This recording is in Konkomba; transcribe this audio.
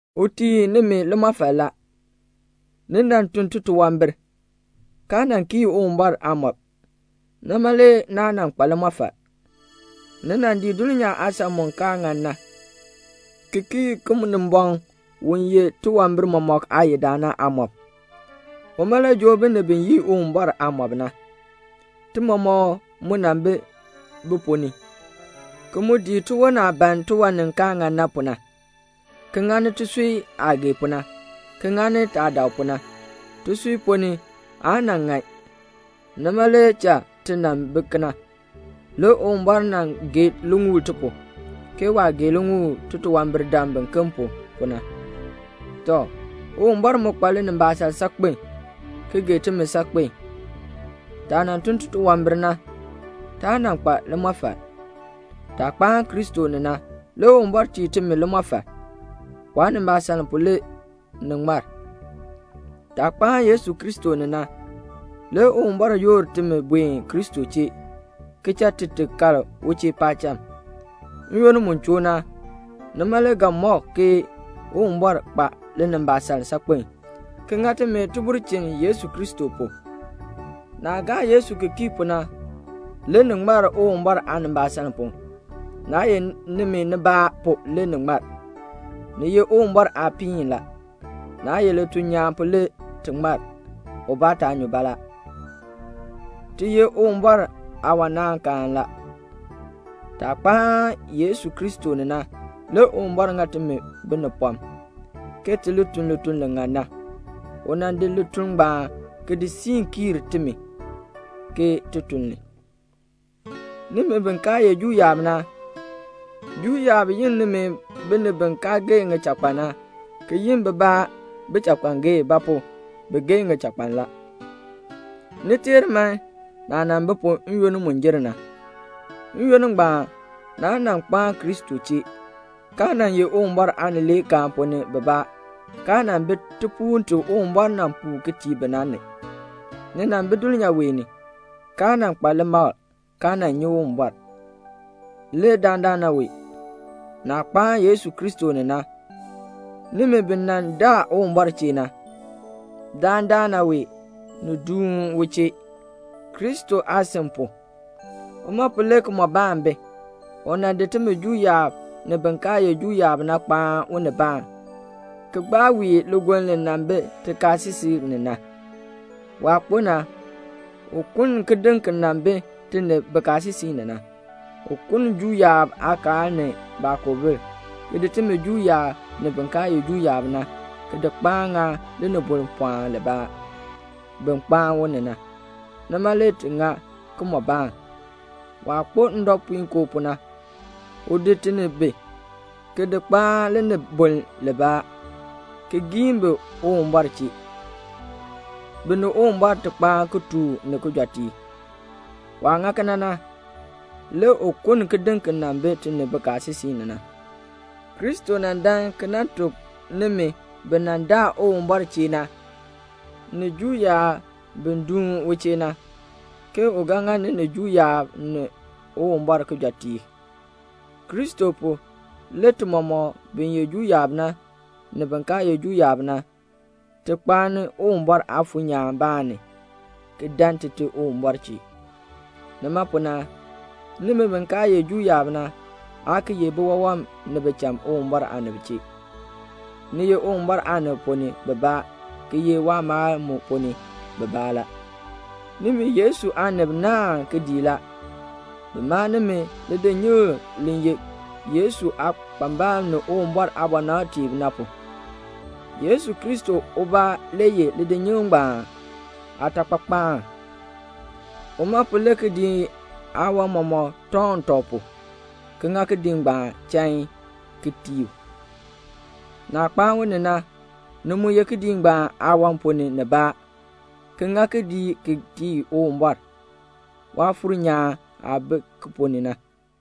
U tii nimi limɔfal la. Ni nan tun titunwambir, kaa nan kii Uwumbɔr aamɔb, nima le naa nan kpa limɔfal. Ni nan dii dulnyaa aasan mu kaa ŋan na, ki kii Kinimbɔŋ u ye tiwambir mɔmɔk aayidaan na aamɔb. Uma le joo binib bi yii Uwumbɔr aamɔb na. Ti mɔmɔk mu nan bi bi ponn ni, ki mu dii tiwon aah ban tiwan ni kaa ŋan na pu na, ki ŋani tisui aah gee pu na, ki ŋani taah dak pu na. Tisui ponn ni aa nan ŋan, nima le cha ti nan bi kena. Le Uwumbɔr nan gee liŋuul ti pu, ke waah gee liŋuul titunwambirdam biken pu, pu na. Tɔ, Uwumbɔr mu kpa linimbaasaln saakpen, ki gee timi saakpen. Taah nan tun titunwambir na, taa nan kpa limɔfal. Taah kpaan Kristo ni na, le Uwumbɔr tii timi limɔfal. Waanimbaasaln pu le ni ŋmar. Taah kpaan Yesu Kristo ni na, le Uwumbɔr yoor timi Kristo chee, ki cha ti kal u chee paacham. N-yoonn mu choo na, nima le ga mɔk ke Uwumbɔr kpa linimbaasaln saakpen, ki ŋa timi tibulchin Yesu Kristo pu. Naah gaa Yesu ki kii pu na, le ni ŋmar Uwumbɔr aanimbaasaln pu. Naa ye nimi nibaa pu le ni ŋmar. Ni ye Uwumbɔr aapiin la. Naa ye lituln nyaan pu le ti ŋmar, ubaa taa nyu baalaa. Ti ye Uwumbɔr aawanaankaan la. Taah kpaan Yesu Kristo ni na, le Uwumbɔr ŋa timi binipɔm, ke ti li tun lituln li ŋan na. U nan di lituln ngbaan ki di siin kiir timi, ke ti tun li. Nimi bi kaa ye Juu yaab na, Juu yaab yi nimi binib bi kaa geei ŋichakpan na, ki yi bibaa bichakpangeei; ba pu? bi geei ŋichakpan la. Ni teer man, naah nan bi pu n-yoonn mu jer na. N-yoonn ngbaan naa nan kpaan Kristo chee, kaa nan ye Uwumbɔr aanileekaan ponn ni bibaa, kaa nan bi tipuul ti Uwumbɔr nan puu tii bi na ni. Ni nan bi dulnyaa wee ni, kaa nan kpa limakl, kaa nan nyi Uwumbɔr. Le dandana wee, naah kpaan Yesu Kristo ni na, nimi bi nan daa Uwumbɔr chee na, dandana wee ni duun u chee, Kristo aasin pu. Uma pu le kimɔbaan bi. U nan di timi Juu yaab, ni bin kaa ye Juu yaab na kpaan unibaan, ki gbaa wii ligoln li nan bi tikaasisik ni na. Waah kpo na, u kuln kidiŋ ki nan bi ti ni bikaasisik ni na. U kuln Juu yaab aakaal ni baakoobil, ki di timi Juu yaab, ni bin kaa ye Juu yaab na, ki di kpaan ŋa linibol pɔɔn libaa, bi kpaan u ni na, nima le ti ŋa kimɔbaan. Waah kpo ndɔpuinkoo pu na, u di ti ni bi, ki di kpaan linibol libaa, ki giin bi Uwumbɔr chee, bi ni Uwumbɔr ti kpaan ki tooh ni kijɔteek. Waah ŋa kena na, le u kuln kidiŋ ki nan bi ti ni bikaasisik ni na. Kristo nan dan ki nan tuk nimi bi nan daa Uwumbɔr chee na, ni Juu yaab bi duun u chee na, ke u ga ŋa ni ni Juu yaab ni Uwumbɔr kijɔteek. Kristo pu, le ti mɔmɔk, bin ye Juu yaab na, ni bin kaa ye Juu yaab na, ti kpaani Uwumbɔr aafuur nyaan baan ni, ki dan Tite Uwumbɔr chee. Nima pu na, nimi bi kaa ye Juu yaab na, aa ki ye biwawam ni bicham Uwumbɔr aanib chee. Ni ye Uwumbɔr aanib ponn ni bibaa, ki ye waamaal mu ponn ni bibaa la. Nimi Yesu aanib naahn kidiik la. Bi maa nimi lidinyikl li ye Yesu aakpambalb ni Uwumbɔr aabɔnabtiib na pu. Yesu Kristo ubaa le ye lidinyikl ngbaan aatakpakpaan. Uma pu le kidiik aawan mɔmɔk tɔŋ tɔb pu, ki ŋa kidiik chain, ki tii u. Naah kpaan u ni na, ni mu ye kidiik ngbaan aawan ponn ni nibaa, ki ŋa kidiik ki tii Uwumbɔr, Waafuur nyaan aah bi ki ponn ni na.